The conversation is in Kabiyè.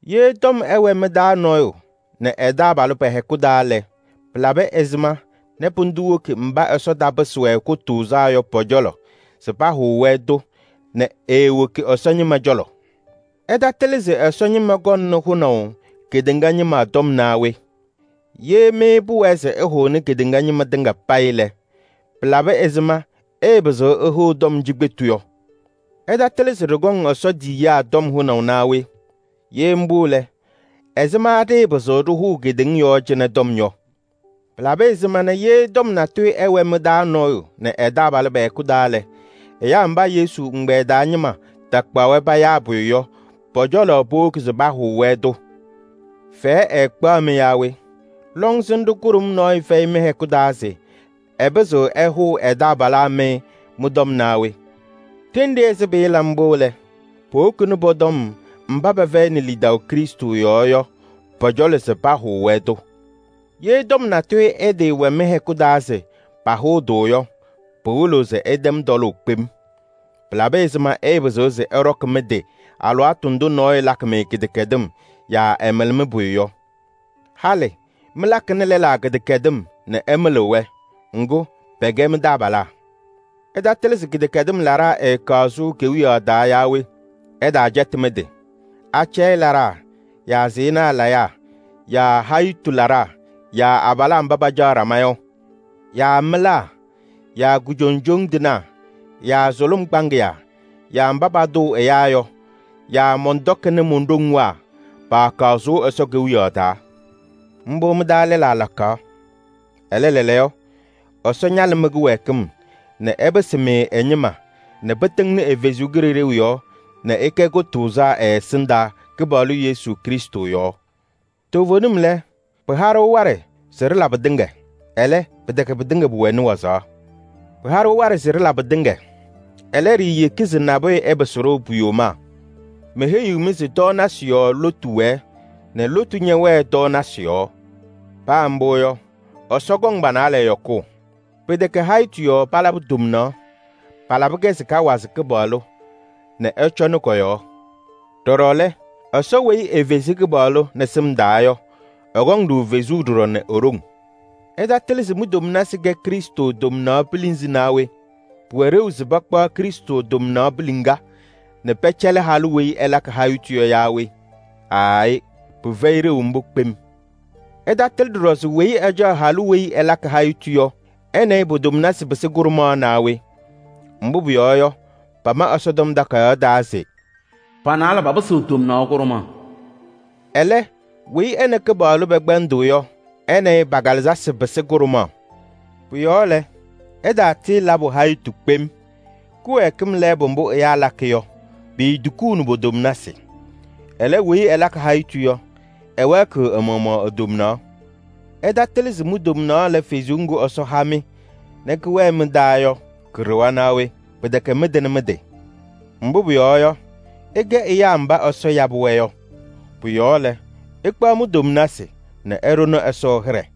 Ye tɔm ɛwɛ mɩ-taa nɔɔyʋ nɛ ɛ-taabalʋ pɛ-hɛkʋ taa lɛ, pɩlabɩ ɛzɩma nɛ pʋdʋ woki mba Ɛsɔ tapɩsɩ-wɛ kʋtʋʋzaa yɔ pɔ-cɔlɔ se pahʋʋ-wɛ-tʋ nɛ eewoki Ɛsɔ ñɩma cɔlɔ? Ɩtatɩlɩ se Ɛsɔ ñɩma kɔŋnɩ hʋnaʋ kedeŋa ñɩma tɔm naa we? Ye mɩ pʋwɛɛ se ɩhʋnɩ kedeŋa ñɩma tɩŋa payɩ lɛ, pɩlabɩ ɛzɩma ɩɩpɩzɩɣ ɩhʋʋ tɔm cikpetu yɔ? Ɩtatɩlɩ se ɖɩkɔŋ Ɛsɔ tiyiyaa tɔm hʋnaʋ naa we? Ye mbʋ lɛ, ɛzɩma ɖɩɩpɩzɩɣ ɖɩhʋʋ kedeŋa yɔɔ cɩnɛ tɔm yɔ? Pɩlabɩ ɛzɩma nɛ ye tɔm natʋyʋ ɛwɛ mɩ-taa nɔɔyʋ nɛ ɛ-taabalʋ pɛ-hɛkʋ taa lɛ, ɛyaa mba Yesu ɛgbɛyɛ taa ñɩma takpaɣ-wɛ payaa pʋyʋ yɔ, pɔ-cɔlɔ powoki se pahʋʋ-wɛ-tʋ? Fɛyɛ ɛɛkpaɣ-mɩ yaa we? Lɔŋsɩnɖʋ kʋɖʋm nɔɔyʋ fɛyɩ mɩ-hɛkʋ taa se ɛpɩzɩɣ ɛhʋʋ ɛ-taabalaa mɩ mɩ-tɔm naa we? Ɖenɖe ɛzɩ pɩɩla mbʋ lɛ, powokini pɔ-tɔm mba pɛfɛyɩnɩ lidaʋ Krɩstʋ yɔɔ yɔ pɔ-cɔlɔ se pahʋʋ-wɛ-tʋ. Ye tɔm natʋyʋ ɛtɩɩwɛ mɩ-hɛkʋ taa se pahʋʋ-tʋ yɔ, pɩwɩlɩɣ se ɩtɛm tɔlʋʋ kpem. Pɩlabɩ ɛzɩma ɩɩpɩzɩɣ se ɩɖɔkɩ mɩ-tɩ alɩwaatʋ ndʋ nɔɔyʋ lakɩ-mɩ kɩdɛkɛdɩm yaa ɛmɩlɩ mɩ-pʋyʋ yɔ? Halɩ mɩlakɩnɩ lɛlaa kɩdɛkɛdɩm nɛ ɩmɩlɩɣ-wɛ. Ŋgʋ, pɛkɛ mɩ-taabalaa! Ɩtatɩlɩ se kɩdɛkɛdɩm laɖaa ɛɛkaɣ sʋʋ Ɛsɔ Kewiyaɣ taa yaa we? Ɩtaacɛtɩ mɩ-tɩ: acɛyɛ laɖaa yaa sɩɩnaa layaa yaa hayitu laɖaa yaa abalaa mba pacaɣ ɖama yɔ yaa mɩlaa yaa kujoŋjoŋ tɩnaa yaa sʋlʋm kpaŋɩyaa yaa mba patʋʋ ɛyaa yɔ yaa mɔntɔkɩnɩ mon-ɖoŋwaa paakaɣ sʋʋ Ɛsɔ Kewiyaɣ taa. Mbʋ mɩ-taa lɛlaa lakaɣ. Ɛlɛ lɛɛlɛɛyɔ, Ɛsɔ ñalɩ mɩ-kɩwɛɛkɩm nɛ ɛpɩsɩ-mɩ ɛ-ñɩma nɛ pɩtɩŋnɩ ɛ-Kalɩzaɣ yɔɔ nɛ ɩkɛ kʋtʋʋzaa ɛ-ɛsɩndaa Kɩpaɣlʋ Yesu Krɩstʋ yɔɔ. Toovenim lɛ: “Pɩha-ɖʋ waɖɛ se ɖɩla pɩtɩŋa,” ɛlɛ, pɩtɛkɛ pɩtɩŋa pʋwɛnɩ wazaɣ. “Pɩha-ɖʋ waɖɛ se ɖɩla pɩtɩŋa,” ɛlɛ, ɖiiyeki se nabʋyʋ ɛpɩsɩ-ɖʋ pu-yomaa. Meheyiɣ-mɩ se: “Tɔɔnasɩ yɔɔ lotu wɛɛ nɛ lotu ñɛwɛɛ tɔɔnasɩ yɔɔ.” Paa mbʋ yɔ, Ɛsɔ kɔŋ pa-naalɛ yɔkʋʋ. Pɩtɛkɛ hayitu yɔɔ palabɩ tomnaɣ: palabɩ-kɛ se kawazɩ Kɩpaɣlʋ nɛ ɛcɔnɩ kɔ-yɔɔ. Ɖɔɖɔ lɛ, Ɛsɔ weyi efezi Kɩpaɣlʋ nɛ sɩm yɔɔ yɔ, ɛkɔŋ-ɖʋ fezuu ɖɔɖɔ nɛ e-ɖoŋ. Ɩtatɩlɩ se mi-tomnasɩ kɛ Krɩstʋ tomnaɣ pilinzi naa we? Pʋwɛ ɖeu se pakpaɣ Krɩstʋ tomnaɣ piliŋa nɛ pɛcɛlɩ halʋ weyi ɛlakɩ hayitu yɔ yaa we? Aayɩ! Pɩfɛyɩ ɖeu mbʋ kpem. Ɩtatɩlɩ ɖɔɖɔ se weyi ɛca halʋ weyi ɛlakɩ hayitu yɔ, ɛ nɛ ɩ po-tomnasɩ pɩsɩ kʋɖʋmaɣ naa we? Mbʋ pʋyɔɔ yɔ, pama Ɛsɔtɔm Takayaɣ taa se: “Pa-naalɛ papɩsɩɣ tomnaɣ kʋɖʋmaɣ.” Ɛlɛ, weyi ɛ nɛ Kɩpaɣlʋ pɛkpɛndɩɣ yɔ, ɛ nɛ ɩ pa-kalɩzasɩ pɩsɩ kʋɖʋmaɣ. Pʋ-yɔɔ lɛ, ɩtaala hayitu kpem. Kɩwɛɛkɩm lɛɛbʋ mbʋ ɛyaa lakɩ yɔ, piitukuuni po-tomnasɩ. Ɛlɛ, weyi ɛlakɩ hayitu yɔ, ɛwɛɛkɩɣ ɛ-maɣmaɣ e-tomnaɣ. Ɩtatɩlɩ se mi-tomnaɣ lɛ Kalɩzaɣ ŋga Ɛsɔ ha-mɩ nɛ kɛwɛɛ mɩ-taa yɔ ka-ɖɩɣa naa we? Pɩtɛkɛ mɩtɩnɩ mɩ-tɩ. Mbʋ pʋyɔɔ yɔ, ɩkɛ ɛyaa mba Ɛsɔ yabɩ-wɛ yɔ. Pʋ-yɔɔ lɛ, ɩkpaɣ mi-tomnasɩ nɛ ɩɖʋnɩ Ɛsɔ hɩɖɛ.